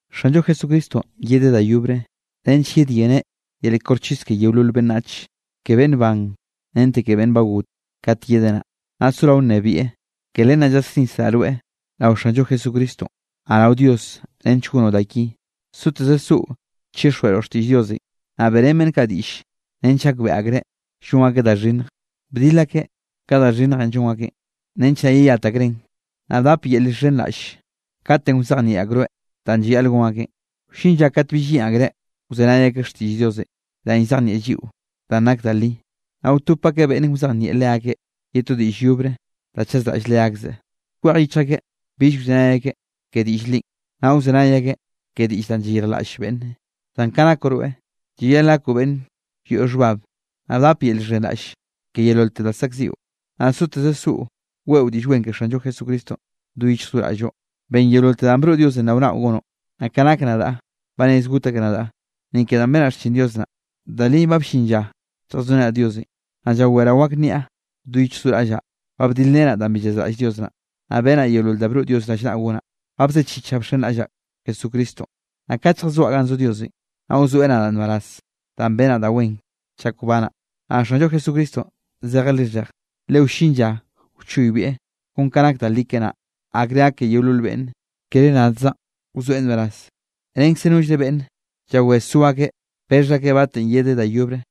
Xanllo Jesucristonꞌ yedeꞌ da yobre nench yedyeneꞌ yel koxchis ke yeolol beꞌnnach, ke beꞌnn ban, rente ke beꞌnn ba got. Kat yedeꞌ naꞌ, naꞌ sorao nnebieꞌ. Ke len naꞌ llasnisraꞌ rweꞌ rao Xanllo Jesucristonꞌ, naꞌ rao Dios nench gonoꞌ da ki. Soteze soꞌo chixjweꞌroꞌ xtiꞌll Diosenꞌ. Naꞌ beꞌrén beꞌnn kaꞌ diꞌll nench gakbeꞌe akreꞌ llon akeꞌ da xhinnje, bdil akeꞌ ka da xhinnjenꞌ llon akeꞌn, nench naꞌ yeyat akreꞌn, naꞌ bdap yel llxhenraꞌll katenꞌ wzejnieꞌ akroeꞌ danꞌ llayaꞌl gon akeꞌn. Wllin lla kat bill yeꞌn akreꞌ wzenay akeꞌ xtiꞌll Diosenꞌ, danꞌ llzejnieꞌ lliꞌo danꞌ nak da li, naꞌ wtop akeꞌ beꞌnne wzejnieꞌ leakeꞌ ye to diꞌll yobre da chazraꞌll leakzeꞌ. Kwej yichj akeꞌ bill wzenay akeꞌ ke diꞌll linꞌ, naꞌ wzenay akeꞌ ke diꞌll da llayirjlaꞌll beꞌnne. Zan ka nakoꞌ rweꞌ, llayaꞌl gakoꞌ beꞌnn yoꞌ xhbab, naꞌ bdap yel llxhenraꞌll ke yeololte da zaꞌkziꞌo, naꞌ soteze soꞌo weꞌo Diꞌll Wen ke Xanllo Jesucristonꞌ do yichj do raꞌlloꞌ. Ben yeololte danꞌ broꞌ Diosenꞌ rao naꞌo gonoꞌ. Naꞌ ka nak nadaꞌ, ba rez got akeꞌ nadaꞌ, ni ke danꞌ benaꞌ xchin Dios naꞌ, da li ba ll-llin lla lljazorenaꞌ Diosenꞌ. Naꞌ llaweraꞌ wak nniaꞌ do yichj do raꞌllaꞌ, ba bdilrenaꞌ danꞌ bi llazraꞌll Dios naꞌ. Ba benaꞌ yeolol da broꞌ Diosenꞌ rallnaꞌ gonaꞌ, ba bzechichaꞌ bxenraꞌllaꞌ Jesucristonꞌ. Naꞌ kat lljazoaꞌ ganꞌ zo Diosenꞌ, naꞌ wzoeꞌ nadaꞌ nbaraz danꞌ benaꞌ da wen chak wbanaꞌ. Naꞌ Xanllo Jesucristonꞌ zejeꞌ lixheje, le wllin lla wchoybieꞌ, kon kanꞌ nak da li keꞌe naꞌ, akre gak ke yeolol beꞌnne, kere nadzaꞌn wzoeꞌ nbaraz, renkze nollre beꞌnne llawé zo akeꞌ bexh akeꞌ batenꞌ yedeꞌ da yobre.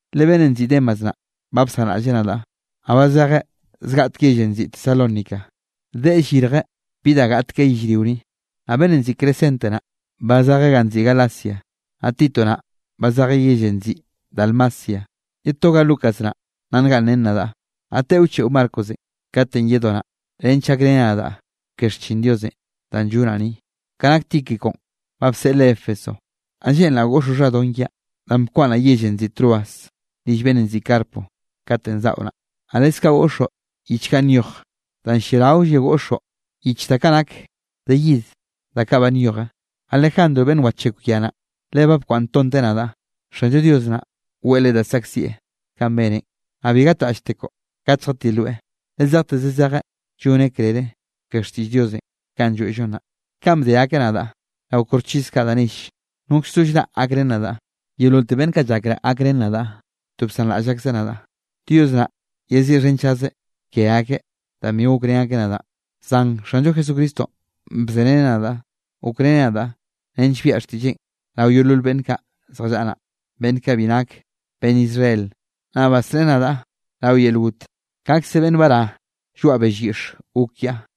Le beꞌnnenꞌ nziꞌi Demas naꞌ ba bsanraꞌlleꞌ nadaꞌ, naꞌ ba zejeꞌ zjateꞌe yellenꞌ nziꞌi Tesalónica, deꞌe llirjeꞌ bi da gaꞌt keꞌe yellrio ni. Naꞌ beꞌnnenꞌ nziꞌi Crescente naꞌ, ba zejeꞌ ganꞌ nziꞌi Galacia, naꞌ Tito naꞌ ba zejeꞌ yellenꞌ nziꞌi Dalmacia. Ye toga Lucas naꞌ nna ngaꞌnnrén nadaꞌ. Naꞌ teꞌo wcheꞌo Marcosenꞌ katenꞌ yedoꞌ naꞌ, nench gakreneꞌ nadaꞌ ke xchin Dios danꞌ llonaꞌ ni. Ka nak Tíquiconꞌ, ba bseꞌleꞌ Éfeso. Naꞌ lleꞌnraꞌ goꞌxoꞌ xhadon kiaꞌ, danꞌ bkwaꞌnnaꞌ yellenꞌ nziꞌi Troas rill beꞌnnenꞌ nziꞌi Carpo, katenꞌ zaꞌo naꞌ, naꞌ leskaꞌ goꞌxoꞌ yich kaꞌ nyoj, da lliaraolle goꞌxoꞌ yich kaꞌ nak de yid da kaꞌ ba nyoje. Alejandro beꞌnn wachekw ya naꞌ, le ba bkwaꞌnntonteꞌ nadaꞌ. Xanllo Dios naꞌ weꞌe leꞌe da saꞌkzieꞌ kanꞌ beneꞌn. Naꞌ bi gatraꞌlltekoꞌ kat lljatiloeꞌ, le zejteze zejeꞌ lloneꞌ krere ke xtiꞌll Diosenꞌ kanꞌ lloeꞌllon naꞌ. Kanꞌ bde akeꞌ nadaꞌ rao koxchis kaꞌ da nelle, nokz no llraꞌ gakrén nadaꞌ, yeololte beꞌnn kaꞌ llakraꞌ gakrén nadaꞌ, to bsanraꞌll akzeꞌ nadaꞌ. Dios naꞌ yeziꞌxhenchazeꞌ ke akeꞌ danꞌ bi gokrén akeꞌ nadaꞌn. Zan Xanllo Jesucristonꞌ bzereneꞌ nadaꞌ gokreneꞌ nadaꞌ, nench biaꞌa xtiꞌlleꞌn rao yeolol beꞌnn kaꞌ zjallaꞌa naꞌ, beꞌnn kaꞌ bi nak beꞌnn Israel. Naꞌ basreꞌe nadaꞌ rao yel got, kaꞌkze beꞌnn bará lloaꞌ bell yiꞌxe, gok kiaꞌ.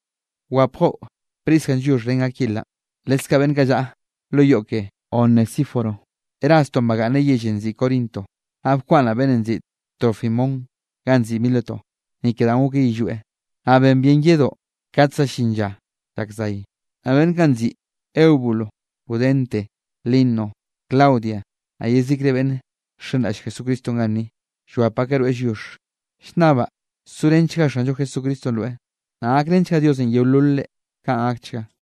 Wapgoꞌ Priscanꞌ lliox ren Aquilanꞌ, leskaꞌ beꞌnn kaꞌ llaꞌa lo yoꞌ ke Onesíforo. Erastonꞌ bagaꞌnneꞌ yellenꞌ nziꞌi Corinto, naꞌ bkwaꞌnnaꞌ beꞌnnenꞌ nziꞌi Trófimonꞌ ganꞌ nziꞌi Mileto, ni ke danꞌ gokeꞌ yillweꞌ. Naꞌ ben bien yedoꞌ kat za llin lla llak zay. Naꞌ beꞌnn kaꞌ nziꞌi Eubulo, Pudente, Lino, Claudia naꞌ yezikre beꞌnn nxenraꞌll Jesucristonꞌ ganni, llwap akeꞌ rweꞌ lliox. Llnnabaꞌ sorenchga Xanllo Jesucristonꞌ rweꞌ, naꞌ gakrenchga Diosenꞌ yeololre. Kaꞌn gakchga.